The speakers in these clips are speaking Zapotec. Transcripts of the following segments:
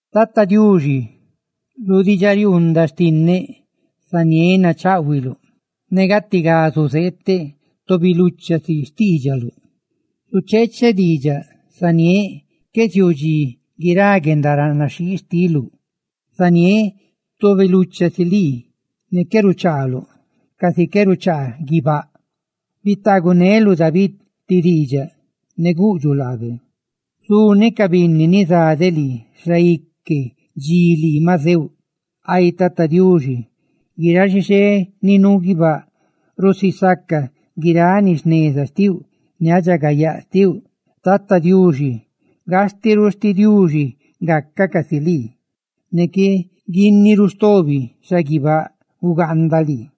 Tata Diuxi, lu diidxariuundaꞌ xtinneꞌzaniéꞌ nacháꞌhuiluꞌ; ne gatigá zuzeeteꞌ tobi lucha si xtiidxaluꞌ. Zucheecheꞌ diidxaꞌ, zaniéꞌ, qué ziuu dxi guirá guendaranaxhii xtiluꞌ; zaniéꞌ tobi lucha si lii ne qué ruchaaluꞌ, casi ca qué ruchaa guibáꞌ. Bitaaguneluꞌ David ti diidxaꞌ; ne guꞌdxuꞌ laabe: «Zuneꞌ ca binni ni za de lii xaique dxi lii maꞌ zeuꞌ.» Ay Tata Diuxi, guiráꞌ xixé ni nuu guibáꞌ rusisácacaꞌ guiráꞌ ni jneza xtiuꞌ ne guendaridxagayaa xtiuꞌ. ¡Tata Diuxi, gastiꞌ ruꞌ sti Diuxi gacaꞌ casi lii, ne qué guinni ruꞌ stobi xaguibáꞌ ugaanda lii!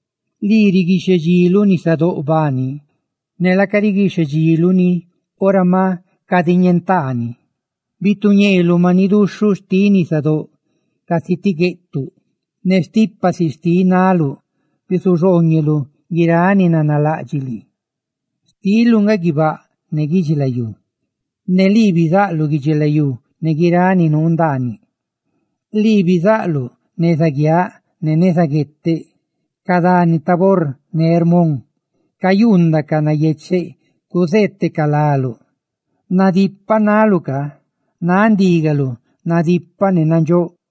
Lii riguixhedxiluꞌ nisadóꞌ bani, ne laaca riguixhedxiluꞌ ni ora maꞌ cadiñentaa ni; bituñeeluꞌ maniꞌ duxhuꞌ xtiꞌ nisadóꞌ casi ti gueꞌtuꞌ; ne stipa si xtiꞌ naꞌluꞌ bisuxhooñeluꞌ guiráꞌ ni nanalaꞌdxiꞌ lii. Xtiluꞌ nga guibáꞌ ne guidxilayú; ne lii bizaꞌluꞌ guidxilayú ne guiráꞌ ni nuu ndaanini. Lii bizaꞌluꞌ neza guiaꞌ ne neza gueteꞌ; ca dani Tabor ne Hermón cayuundacaꞌ nayecheꞌ cuzeetecaꞌ láluꞌ. Nadipaꞌ naluꞌ ca; náꞌ ndígaluꞌ nadipaꞌ ne nandxóꞌ.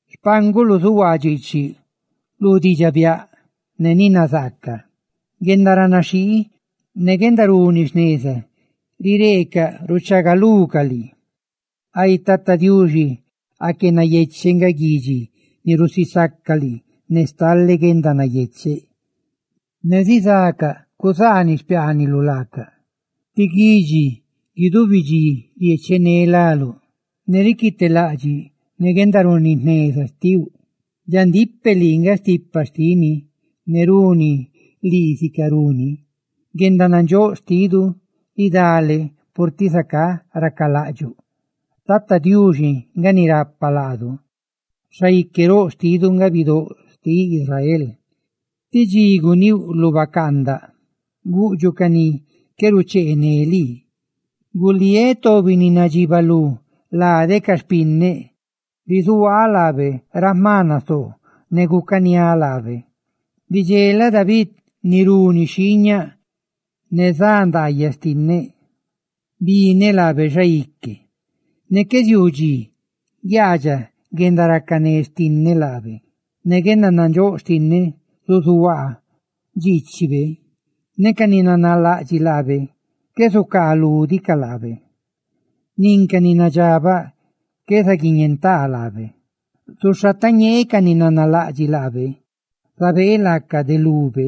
Xpánguluꞌ zuhuaa dxiichini lu diidxaꞌ biaꞌ ne ni nazaaca; guendaranaxhii ne guendaruni jneza rireecaꞌ ruchagalucaꞌ lii. Ay Tata Diuxi, aque nayecheꞌ nga guidxi ni rusisaca lii ne stale guendanayecheꞌ, ne zizacaꞌ cuzaaniꞌ xpiaaniluꞌ laacaꞌ, ne guidubi dxi riechené láluꞌ ne riquitelaꞌdxiꞌ ne guendaruni jneza xtiuꞌ. Dxandíꞌ peꞌ, lii nga stipa xtini ne runi lii sicarú ni; guendanandxóꞌ xtidu ridale purtiꞌ zacá racalaꞌdxuꞌ. ¡Tata Diuxi nga ni rapa laadu! ¡Xaique roꞌ xtidu nga Bidóꞌ xtiꞌ Israel! Ti dxi guníuꞌ lu bacaandaꞌ, guꞌdxuꞌ ca ni qué rucheené lii: «Guliéꞌ tobi ni nadxibalú lade ca xpinneꞌ, bizuhuaa laabe ra jma nasoo ne gucaniáꞌ laabe. ¡Bidxelaꞌ David ni runi xhiiñaꞌ! Ne za ndaayaꞌ xtinneꞌ bineꞌ laabe xaique, ne qué ziuu dxi guiaadxaꞌ guendaracané xtinneꞌ laabe. Ne guendanandxóꞌ xtinneꞌ zuzuhuaa dxiichibe, ne ca ni nanalaꞌdxiꞌ laabe qué zucaalúdicaꞌ laabe, nin ca ni nadxabaꞌ qué zaguiñentaa laabe. Zuxhatañee ca ni nanalaꞌdxiꞌ laabe; ¡zabee laacaꞌ de lube!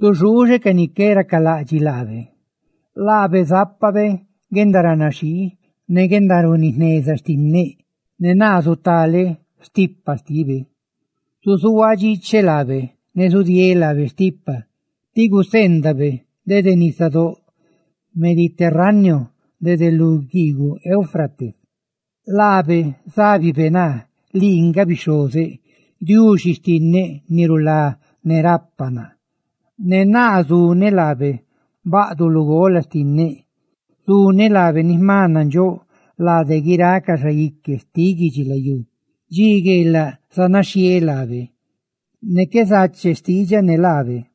¡Zuxuuxeꞌ ca ni qué racalaꞌdxiꞌ laabe! Laabe zápabe guendaranaxhii ne guendaruni jneza xtinneꞌ, ne naa zutaleꞌ stipa xtibe. Zuzuhuaaꞌ dxiicheꞌ laabe ne zudieeꞌ laabe stipa ti gacaꞌ ni nabe dede nisadóꞌ Mediterráneo dede lu guiiguꞌ Éufrates. Laabe zábibe naa: "Lii nga bixhozeꞌ; Diuxi xtinneꞌ, ni rulá ne rapa naa." Ne naa zuneꞌ laabe baꞌduꞌ lugola xtinneꞌ, zuneꞌ laabe ni jma nandxóꞌ lade guiráꞌ ca xaique xtiꞌ guidxilayú. Dxi gueelaꞌ zanaxhieeꞌ laabe, ne qué zache xtiidxaꞌ ne laabe.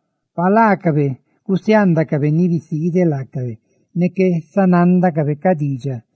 »Pa laacabe gusiaandacabe ni bisiideꞌ laacabe ne qué sa nándacabe ca xtiidxaꞌ,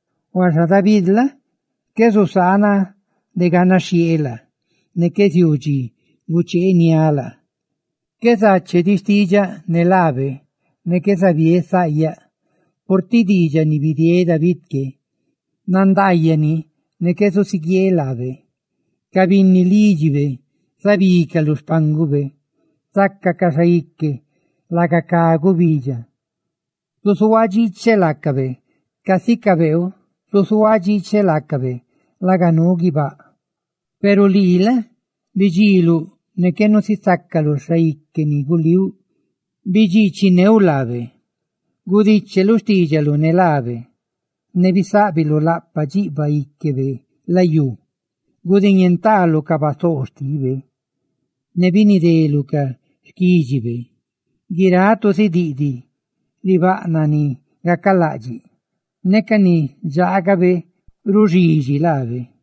huaxa David la? qué zusaanaꞌ de ganaxhieeꞌ laa, ne qué ziuu dxi gucheeniáꞌ laa. Qué zache diꞌ xtiidxaꞌ ne laabe, ne qué zabiéꞌ saꞌyaꞌ. Purtiꞌ diidxaꞌ ni bidieeꞌ David que nandaayaꞌ ni, ne qué zusuguieeꞌ laabe: ca binni lídxibe zabicaꞌ lu xpángube zácacaꞌ xaique, laga cá gubidxa. ¡Zuzuhuaaꞌ dxiicheꞌ laacabe, casi cá beeu! ¡Zuzuhuaaꞌ dxiicheꞌ laacabe, laga nuu guibáꞌ!» Peru lii la? bidxiiluꞌ ne qué nusisácaluꞌ xaique ni gulíuꞌ; ¡bidxiichineuꞌ laabe! Gudicheluꞌ xtiidxaluꞌ ne laabe; ne bisáꞌbiluꞌ laꞌpaꞌ dxiꞌbaꞌ íquebe layú. Gudiñentaaluꞌ ca basoo xtibe; ¡ne binideluꞌ ca xquídxibe! Guiráꞌ tu zidiꞌdiꞌ ribaꞌnaꞌ ni gacalaꞌdxiꞌ; ne ca ni dxaagabe ruxidxi laabe.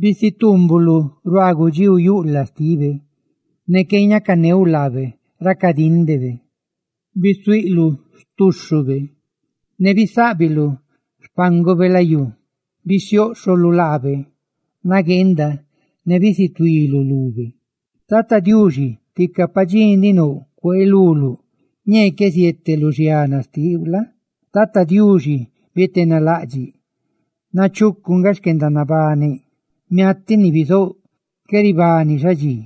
Bisituumbuluꞌ ruaa gudxíu yuꞌlaꞌ xtibe, ne qué ñacaneuꞌ laabe ra cadíndebe. Bisuiꞌluꞌ xtúxhube; ne bisáꞌbiluꞌ xpángube layú; bisióꞌxholuꞌ laabe nagueenda, ne bisutuiluꞌ lube. Ay Tata Diuxi, tica pa dxi ndiꞌ nouꞌ gucaachiluluꞌ. Ñee qué ziete lu xiana xtiuꞌ la? Tata Diuxi, bietenalaꞌdxiꞌ nachucu nga xquendanabaneꞌ; miatiꞌ ni bizouꞌ, qué ribani xadxi.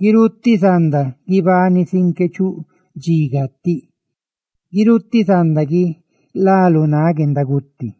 ¡Guirutiꞌ zanda guibani sin qué chuu dxi gatiꞌ! ¡Guirutiꞌ zanda guilá lu náꞌ guendaguti!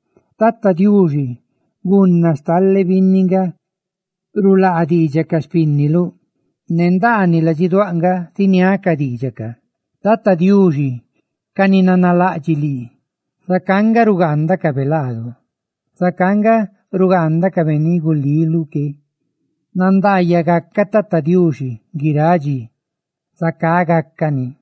Tata Diuxi, gunna stale binni nga rulaa diidxaꞌ ca xpínniluꞌ; ne ndaaniꞌ ladxiduáꞌ nga ziniáꞌ ca di ca. Ay Tata Diuxi, ¡ca ni nanalaꞌdxiꞌ lii, zacá nga rugaandacaꞌ laadu! ¡Zacá nga rugaandacabe ni gulíuꞌ que, gatigá! Nandaayaꞌ gacaꞌ Tata Diuxi guiráꞌ dxi. ¡Zacá gácani!